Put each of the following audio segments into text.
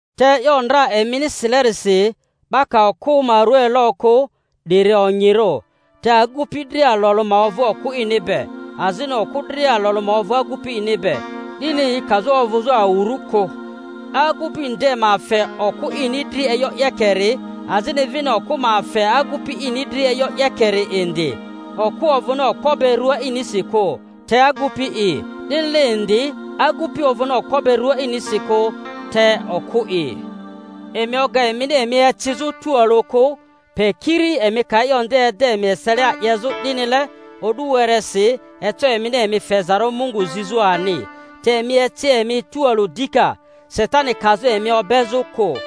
Te e'yo ndra emini silerisi: 'Ba ka okᴜ ma rua elo kᴜ, 'diri onyirᴜ. Te agupi dria alᴜ alᴜ ma ovᴜ okᴜ ini be, azini okᴜ dria alᴜ alᴜ ma ovᴜ agupi ini be, 'dini yi kazᴜ ovᴜzᴜ awurᴜ kᴜ. Agupi nde ma fe okᴜ ini dri e'yo 'yekeri, azini vini okᴜ ma fe agupi ini dri e'yo 'yekeri indi. Okᴜ ovᴜni okpo be rᴜa inisi kᴜ, te agupi'i; 'dinile indi agupi ovᴜni okpo be rᴜa inisi kᴜ, te okᴜ'i. Emi oga emini emi ecizᴜ tualᴜ kᴜ, pe kiri emi ka e'yo ede emi eselia 'yezᴜ 'dinile o'du weresi, eco emini emi fezarᴜ Mungu zizᴜ ani; te emi eci emi tᴜalᴜ dika, Satani kazᴜ emi obezᴜ kᴜ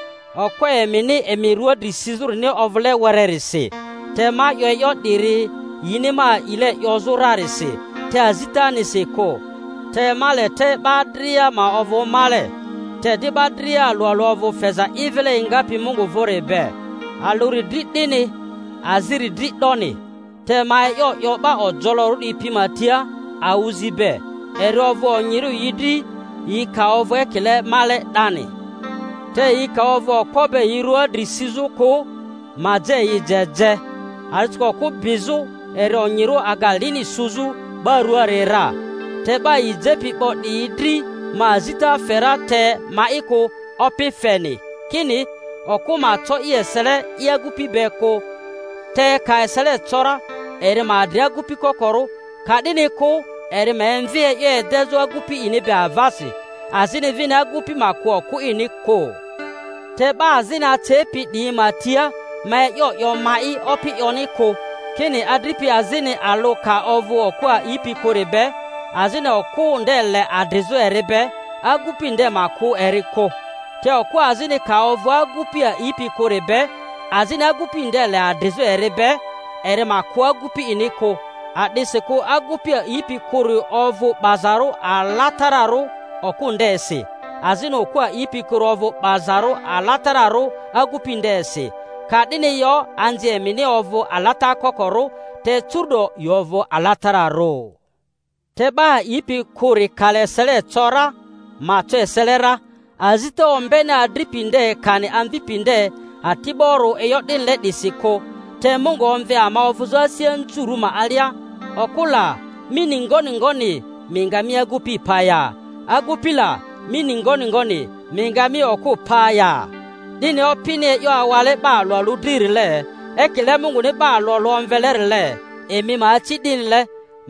okpo emini emi rua dri sizᴜrini ovᴜle wererisi. Te ma 'yo e'yo 'diri yini ma a'ile 'yozᴜ rarisi, te azitanisi kᴜ. Te ma le te 'ba dria ma ovᴜ male. Te di 'ba dria alᴜ alᴜ ovᴜ feza i vile engapi Mungu vᴜri be, alᴜri dri 'dini, aziri dri 'doni. Te ma e'yo 'yo 'ba ojolorᴜ 'diyi pi ma tia awᴜzi be, eri ovᴜ onyirᴜ yi dri yi ka ovᴜ ekile male 'dani. Te yi ka ovᴜ okpo be yi rᴜa dri sizᴜ kᴜ, ma je yi je je. A'disikᴜ okᴜ bizᴜ eri onyirᴜ aga lini suzᴜ 'ba rᴜaari ra. Te 'ba yi jepi 'bo 'diyi dri ma azita fe ra, te ma'i kᴜ, Opi feni, kini, okᴜ ma co i esele i agupi be kᴜ (te ka esele co ra, eri ma adri agupi kokorᴜ, ka'dini kᴜ eri ma emvi e'yo edezᴜ agupi ini be avasi)—azini vini agupi ma kᴜ okᴜ ini kᴜ. Te 'ba azini acepi 'diyi ma tia ma e'yo 'yo ma'i, Opi 'yoni kᴜ, kini adripi azini alᴜ ka ovᴜ okᴜ a'ipi kᴜri be, azini okᴜ nde le adrizᴜ eri be, agupi nde ma kᴜ eri kᴜ. Te okᴜ azini ka ovᴜ agupi a'ipi kᴜri be, azini agupi nde le adrizᴜ eri be, eri ma kᴜ agupi ini kᴜ. A'disikᴜ agupi a'ipi kᴜri ovᴜ 'bazarᴜ alatararᴜ okᴜ ndesi, azini okᴜ a'ipi kᴜri ovᴜ 'bazarᴜ alatararᴜ agupi ndesi. Ka'dini yo anzi emini ovᴜ alata kokorᴜ, te curu'do yi ovᴜ alatararᴜ. Te 'ba a'ipi kᴜri ka le esele co ra, ma co esele ra; azita ombeni adripi nde kani amvipi nde ati'borᴜ e'yo 'dinile 'disi kᴜ. Te Mungu omve ama ovᴜzᴜ asi anzurᴜ ma alia. Okᴜ la! mi ni ngoni ngoni mi nga mi agupi pa ya? Agupi la! mi ni ngoni ngoni mi nga mi okᴜ pa ya? 'Dini Opini e'yo awale 'ba alᴜ alᴜ dririle, ekile Munguni 'ba alᴜ alᴜ omvelerile, eri ma aci 'dinile.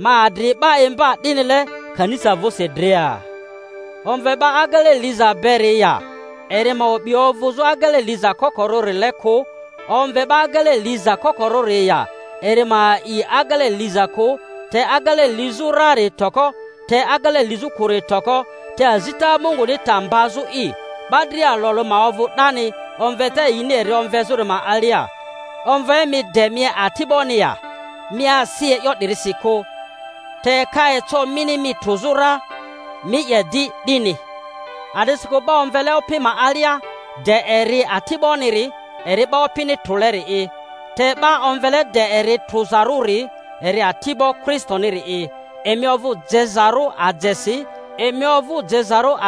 Ma adri 'ba imba 'dinile kanisa vᴜsi dria. Omve 'ba agele liza beri ya? Eri ma o'bi ovᴜzᴜ agele liza kokorᴜrile kᴜ. Omve 'ba agele liza kokorᴜri ya? Eri ma a'i agele liza kᴜ. Te agele lizᴜ rari toko, te agele lizᴜ kᴜri toko, te azita Munguni ta mbazᴜ'i. 'Ba dria alᴜ alᴜ ma ovᴜ 'dani omveta yini eri omvezᴜri ma alia. Omve mi de mi ati'boni ya? Mi asi e'yo 'dirisi kᴜ. Te ka eco mini mi trᴜzarᴜ ra, mi 'ye di 'dini. A'disikᴜ 'ba omvele Opi ma alia de eri ati'boniri, eri 'ba Opini trᴜleri'i. Te 'ba omvele de eri trᴜzarᴜri, eri ati'bo Kristoniri'i. Emi ovᴜ je-zarᴜ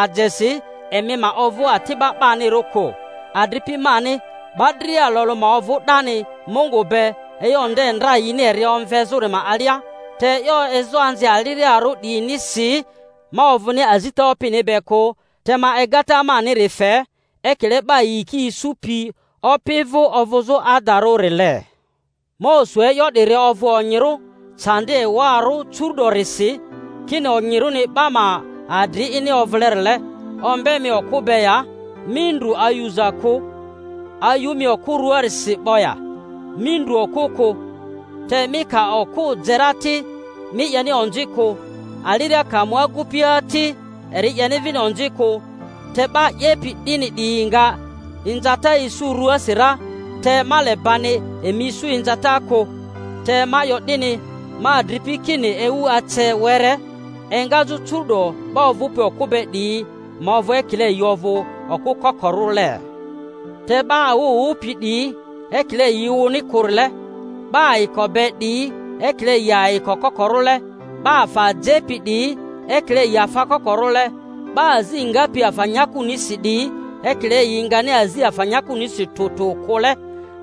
ajesi; emi ma ovᴜ ati'ba 'banirᴜ kᴜ. Adripi mani, 'ba dria alᴜ alᴜ ma ovᴜ 'dani Mungu be, e'yo nde ndra yini eri omvezᴜri ma alia. Te e'yo ezoanzi aliriarᴜ 'diyinisi ma ovᴜni azita Opini be kᴜ, te ma egata maniri fe, ekile 'ba yiki isu-pi Opi vᴜ ovᴜzᴜ adarᴜrile. Ma osu e'yo 'diri ovᴜ onyirᴜ candi ewarᴜ curu'dorisi, kini onyirᴜni 'ba ma adri ini ovᴜlerile. Ombe mi okᴜ be ya? Mi ndrᴜ ayuza kᴜ. Ayu mi okᴜ rᴜaarisi 'bo ya? Mi ndru okᴜ kᴜ. Te mi ka okᴜ je ra ti, mi 'yeni onzi kᴜ; aliria ka mu agupia ti, eri 'yeni vini onzi kᴜ. Te 'ba 'yepi 'dini 'diyi nga inzata isu rᴜasi ra, te ma le bani emi isu inzata kᴜ. Te ma 'yo 'dini, ma adripi, kini ewu ace were; engazᴜ curu’do 'ba ovupi okᴜ be 'diyi ma ovᴜ ekile yi ovᴜ okᴜ kokorᴜle, te 'ba awᴜ wᴜpi 'diyi ekile yi wᴜni kᴜrile, 'ba ayiko be 'diyi ekile yi ayiko kokorᴜle, 'ba afa jepi 'diyi ekile yi afa kokorᴜle, 'ba azi ngapi afa nyakunisi 'diyi ekile yi ngani azi afa nyakunisi tᴜ tᴜ kᴜle.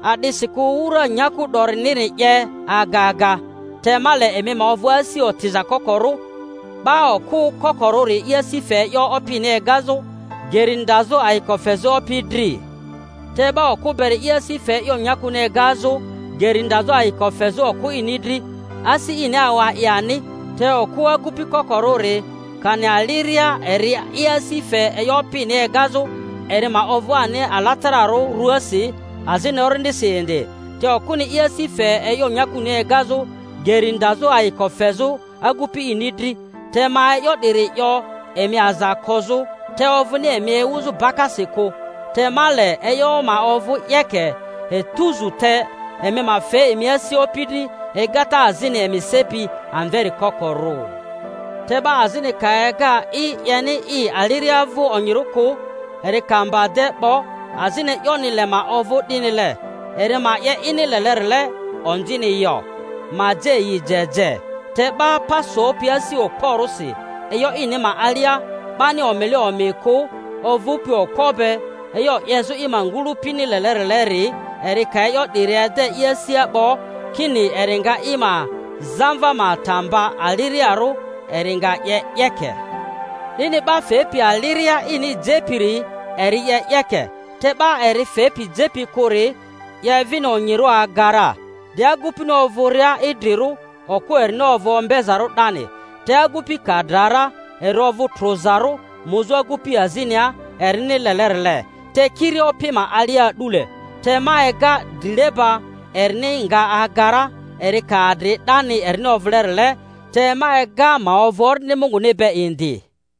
A'disikᴜ wura nyaku 'doriniri 'ye aga aga. Te ma le emi ma ovᴜ asi otiza kokorᴜ. 'Ba okᴜ kokorᴜri i asi fe e'yo Opini egazᴜ, geri ndazᴜ ayiko fezᴜ Opi dri; te 'ba okᴜ beri i asi fe e'yo nyakuni egazᴜ. geri ndazᴜ ayiko fezᴜ okᴜ ini dri, asi ini awa i ani. Te okᴜ agupi kokorᴜri kani aliria eri i asi fe e'yo Opini egazᴜ, eri ma ovᴜ ani alatararᴜ ruasi azini orindisi indi; te okᴜni i asi fe e'yo nyakuni egazᴜ, geri ndazᴜ ayiko fezᴜ agupi ini dri. Te ma e'yo 'diri 'yo emi aza kozᴜ, te ovᴜni emi ewuzᴜ bakasi kᴜ, te ma le e'yo ma ovᴜ 'yeke etuzu, te emi ma fe emi asi opi dri egata azini emi sepi amveri kokorᴜ. Te 'ba azini ka ega i 'yeni i aliria vᴜ onyirᴜ kᴜ, eri ka mba de 'bo, azini e'yoni le ma ovᴜ 'dinile, eri ma 'ye ini lelerile: onzini yo—ma je yi je je. Te 'ba pa sopi asi okporᴜsi e'yo ini ma alia, 'bani omile omi kᴜ, ovᴜpi okpo be e'yo 'yezᴜ i ma ngᴜlᴜpini lelerileri, eri ka e'yo 'diri ede i asia 'bo kini eri nga i ma zamva ma ta mba aliriarᴜ, eri nga 'ye 'yeke. 'Dini 'ba fepi aliria ini jepiri eri 'ye 'yeke; te 'ba eri fepi jepi kᴜri 'ye vini onyirᴜ aga ra. De agupini ovᴜria idrirᴜ, okᴜ erini ovᴜ ombezarᴜ 'dani. Te agupi ka dra ra eri ovᴜ trᴜzarᴜ muzᴜ agupi azinia erini lelerile, te kiri Opi ma alia a'dule. Te ma ega drileba erini nga aga ra eri ka adri 'dani erini ovᴜlerile. Te ma ega ma ovᴜ Orindi Munguni be indi.